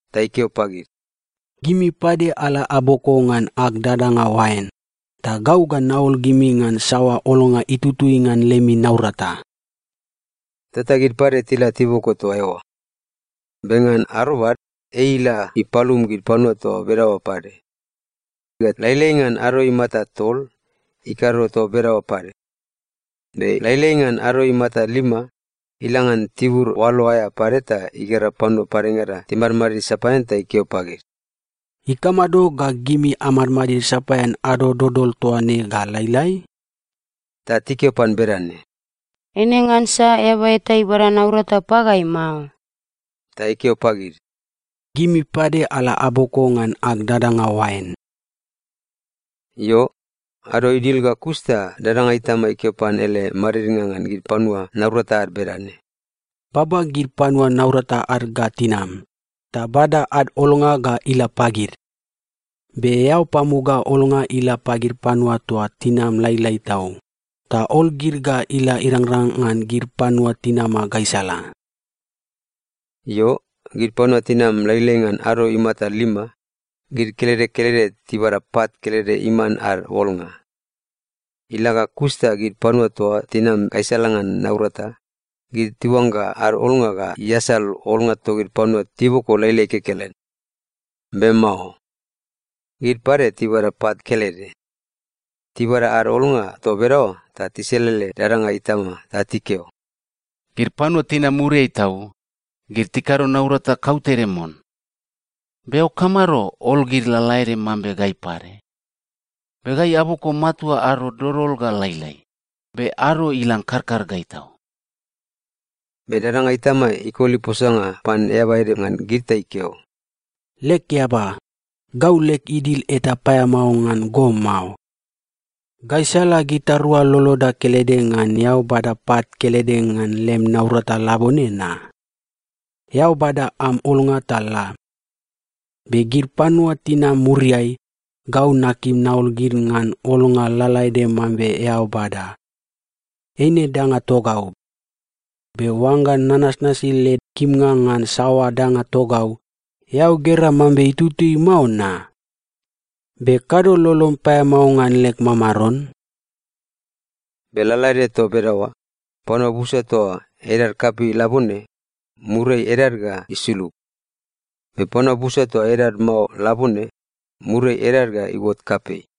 Ta ikeo pagid, ‘Gimi pade ala aboko ngan ag dadanga oain, ta gau ga naol gimi ngan saoa olnga itutui ngan lemi naurata.’ Tota gid pade tila tiboko toa eoa. “Be ngan arobad ei ila ipalum gid panua toa bedaoa pade, ga lailai ngan ado imata tol, ikado toa bedaoa pade. Be lailai ngan ado imata lima, ila ngan tibur oalo aea pade ta igera panua padengada timadmadid sapaean ta ikeo pagid, ‘Ikamado ga gimi amadmadid sapaean ado dodol toa ne ga lailai?’ “Ta tikeo pan bedane, ‘Eine ngansa eaba eta ibada naurata pagai mao.’ “Ta ikeo pagid, ‘Gimi pade ala aboko ngan ag dadanga oain.’ “Io, ado idil ga kus ta dadanga itama ikeo pan ele madidnga ngan gid panua naurata ad bedane, ‘Baba gid panua naurata ad ga tinam, ta bada ad olnga ga ila pagid. Be eao pamuga olnga ila pagid panua toa tinam lailai tau, ta ol gid ga ila irangrang ngan gid panua tinama gaisala.’ “Io, gid panua tinam lailai ngan ado imata lima, gid kelede kelede tibada pat kelede iman ad olnga. Ila ga kus ta gid panua toa tinama gaisala ngan naurata, gid tiuangga ad olnga ga iasal olnga togid panua tiboko lailai kekelen. Be mao. Gid pade tibada pat kelede. Tibada ad olnga toa bedaoa ta tiselele dadanga itama ta tikeo, ‘Gid panua tinam muriai tau, gid tikado naurata kautede mon, be eao kamado ol gid lalaede mambe gai pade? Be gai aboko matua ado dodol ga lailai, be ado ilang karkar gai tau!’ “Be dadanga itama ikoli posanga pan eaba ede ngan gid ta ikeo, ‘Leg eaba, gau leg idil eta paeamao ngan go mao. Gaisala gitarua loloda kelede ngan eao bada pat kelede ngan lem naurata labone na? Eao bada am olnga ta la. Be gid panua tinam muriai, gau nakim naol gid ngan olnga lalaede mambe eao bada. Eine danga togau. Be oangga nanasi leg kimnga ngan saoa danga togau, eao gera mambe itutui mao na? Be kado lolom paeamao ngan leg mamaron?’” “Be lalaede toa bedaoa, panua busa toa edad kapei labone, muriai edad ga isulug. Be panua busa toa edad mao labone, muriai edad ga iuot kapei.”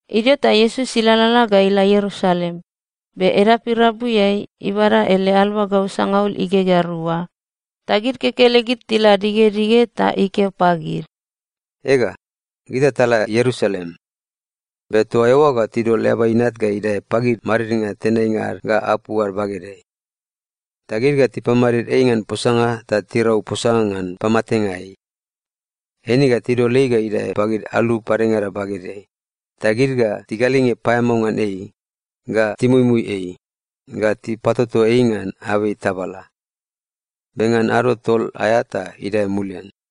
Idio ta Iesus ilalala ga ila Ierusalem, be edap irabuiai, ibada ele aluagau sangaul igegea rua, ta gid kekelegid tila digedige ta ikeo pagid, “Ega, gita tala Ierusalem. Be toa eoa ga tidol Eaba Inat ga idae pagid madidnga tenainga ad ga apu ad bagedeai. Ta gid ga tipamadid ei ngan posanga ta tirau posanga ngan pamatenga ei. Eine ga tidol ei ga idae pagid alu padengada bagedeai, ta gid ga tigalinge paeamao ngan ei, ga timuimui ei, ga tipatoto ei ngan abei tabala. Be ngan ado tol aea ta idae mulian.”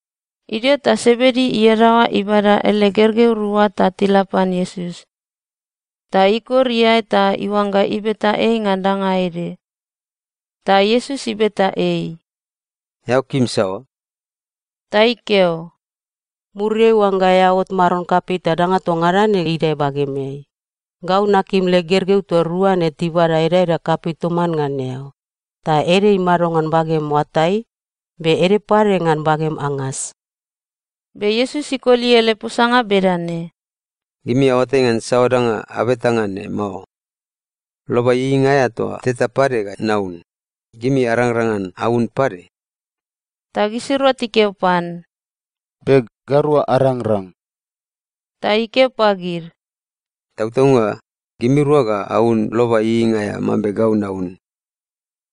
Idio ta Sebedi iadaoa ibada ele gergeu rua ta tila pan Iesus. Ta ikor iae ta iuangga ibeta ei ngan danga ede. Ta Iesus ibeta ei, “Eao kim saoa?” Ta ikeo, “Muriai oangga eao ot Maron kapei ta danga toa ngada ne idae bagemeai, gau nakim leg gergeu toa rua ne tibada edaeda kapei toman ngan eao, ta ede imado ngan bagem oatai, be ede pade ngan bagem angas.” Be Iesus ikoli ele posanga bedane, “Gimi aoatai ngan saoa danga abeta ngan ne mao. Loba ieieinga aea toa teta pade ga naun, gimi arangrang ngan aun pade?” Ta gisirua tikeo pan, “Be. Gairua arangrang.” Ta ikeo pagid, “Tautaunga, gimirua ga aun loba ieieinga aea mambe gau naun.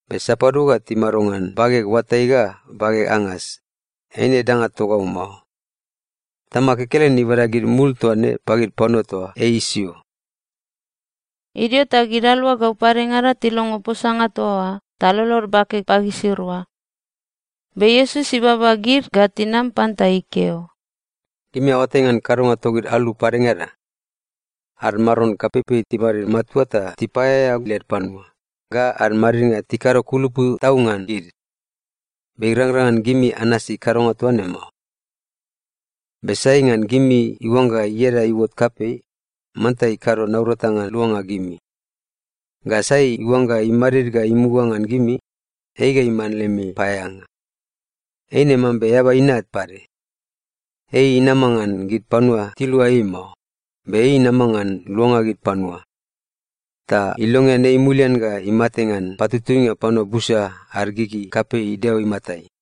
Be sapadua ga timado ngan bageg oatai ga bageg angas, eine danga togau mao. Tamag kekelen ibada gid mul toa ne pagid panua toa ei isio.” Idio ta gid aluagau padengada tilongo posanga toa oa ta lolod bake pagisirua. Be Iesus ibaba gid ga tinam pan ta ikeo, “Gimi aoatai ngan kadonga togid alu padengada. Ad mamaron kapeipei timadid matua ta tipaeaea led panua, ga ad madidnga tikado kulupu tau ngan gid. Be irangrang ngan gimi anasi kadonga toa ne mao. Be sai ngan gimi iuangga ieda iuot kapei, manta ikado naurata ngan luanga gimi. Ga sai iuangga imadid ga imuga ngan gimi, ei ga iman lemi paeaeanga. Eine mambe Eaba Inat pade. Ei inama ngan gid panua tilua ei mao, be ei inama ngan luanga gid panua. Ta ilongean ei mulian ga imate ngan patutuinga panua busa ad gigi kapei Deo imatai.”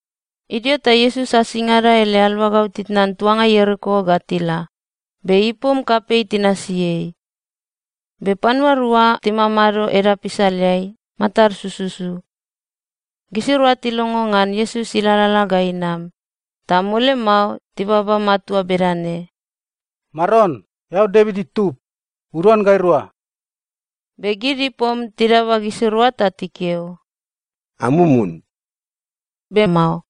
Idio ta Iesus asingada ele aluagau titnan tuanga Ieriko ga tila, be ipom kapei tinasi ei. Be panua rua timamado edap isaleai, matad sususu. Gisirua tilongo ngan Iesus ilalala ga inam, ta mole mao tibaba matua bedane, “Maron, eao Devit itub, uduan gairua!” Be gid ipom tidaba gisirua ta tikeo, “Amumun!” Be mao.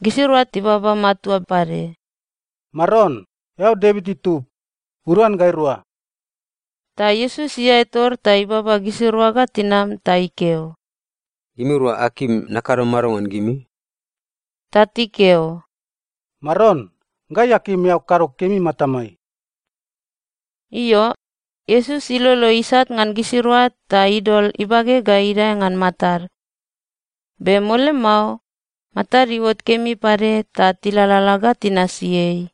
Gisirua tibaba matua pade, “Maron, eao Devit itub, uduan gairua!” Ta Iesus iae tor ta ibaba gisirua ga tinam ta ikeo, “Gimirua akim nakado mado ngan gimi?” Ta tikeo, “Maron, gai akim eao kado kemi matamai.” Io, Iesus ilolo isat ngan gisirua ta idol ibage ga idae ngan matad. Be mole mao, matad iuot kemi pade ta tilalala ga tinasi ei.